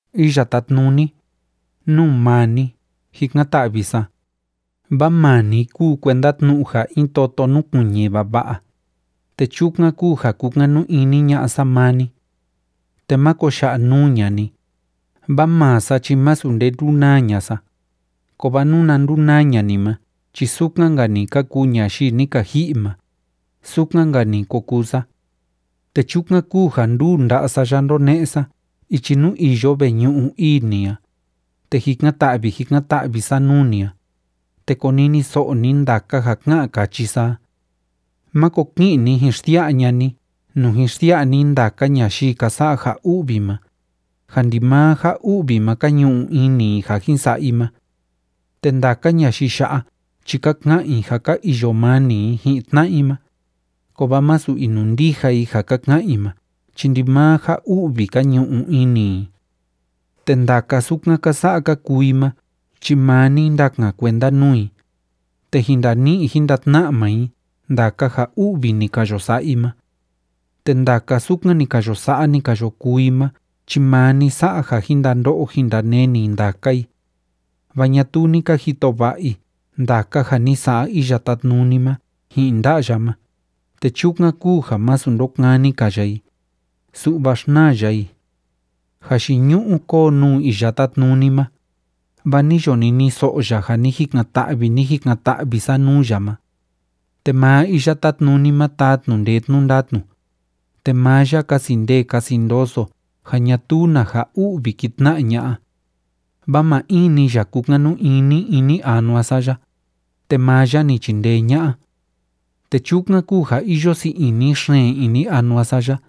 Iya Tátnuni, nuu maa ni jikan‑ta'vi sa, vaa maa ni kúu kuenda tnu'u in toto núkuiñi vava'a, te chukan kúu ja kúkanu ini ña'a sa maa ni. Te máko ya'a nuu ña'a ni, vaa maa sa chi masu nde ndúnaa ña'a sa, kovaa nuna ndunaa ña'a ni ma chi sukan‑nka‑ni ka kuu ñayii ni ka ji'i ma, sukan‑nka‑ni ko kuu sa. Te chukan kúu ja nduu nda'a sa ya ndóne'e sa ichi nuu iyo veñu'u ii ni a, te jikan‑ta'vi jikan‑ta'vi sa nuu ni a, te koniniso'o ni ndaka ja ká'an káchi sa a. Máko ki'in ni jin xsia'a ña'a ni nuu jin xsia'a ni ndaka ñayii ka sa'a ja u'vi ma, ja ndimaa ja u'vi ma ka ñu'u ini i ja jin sa'a i ma. Te ndaka ñayii ya'a chi ka ka'an i ja ka iyo mani i ji'in tna'a i ma, kovaa masu inundija i ja ka ka'an i ma chi ndimaa ja u'vi ka ñu'u ini i. Te ndaka sukan ka sa'a ka kuu i ma chi maa ni ndakan kuenda nuu i, te jin ndani'i jin ndatna'a maa i ndaka ja u'vi ni ka yo sa'a i ma. Te ndaka sukan ni ka yo sa'a, ni ka yo kuu i ma chi maa ni sa'a ja jin ndando'o jin ndaneni ndaka i. Vaa ñatuu ni ka jito va'a i ndaka ja ni sa'a Iya Tátnuni ma ji'in nda'a ya ma, te chukan kúu ja másu ndokani‑ka ya i, su'va xnaa ya i. Jayiñu'u kóo nuu Iya Tátnuni ma, vaa ni yo niniso'o ya ja ni jikan‑ta'vi, ni jikan‑ta'vi sa nuu ya ma. Te maa Iya Tátnuni ma taa tnu'u ndee tnu'u ndatnu, te maa ya kasi ndee kasi ndoso ja ñatuu na ja u'vi ki tna'a ña'a. Vaa maa in‑ni ya kúkanu ini ini anua sa ya, te maa ya ni chindee ña'a. Te chukan kúu ja iyo sii ini xeen ini anua sa ya,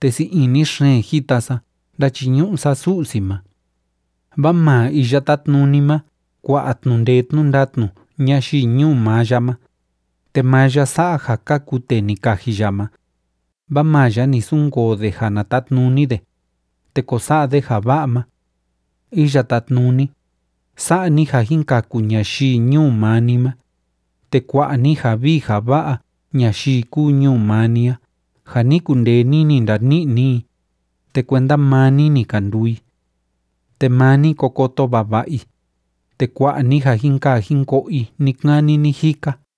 te sii ini xeen jita sa ndáchiñu'u sa Su'si ma. Vaa maa Iya Tátnuni ma kua'a tnu'u ndee tnu'u ndatnu ñayii ñuu maa ya ma, te maa ya sa'a ja kaku tee ni kaji ya ma, vaa maa ya ni sunkoo de ja na tatnuni de, te ko sa'a de ja va'a ma. Iya Tátnuni, sa'a ni ja jin kaku ñayii ñuu maa ni ma, te kua'a ni ja vii ja va'a ñayii kúu ñuu maa ni a ja ni kundee ni ni ndani'i ni i, te kuenda maa ni ni ka nduu i. Te maa ni ko koto vava'a i, te kua'a ni ja jin kaa jin ko'o i ni‑kani ni‑jika.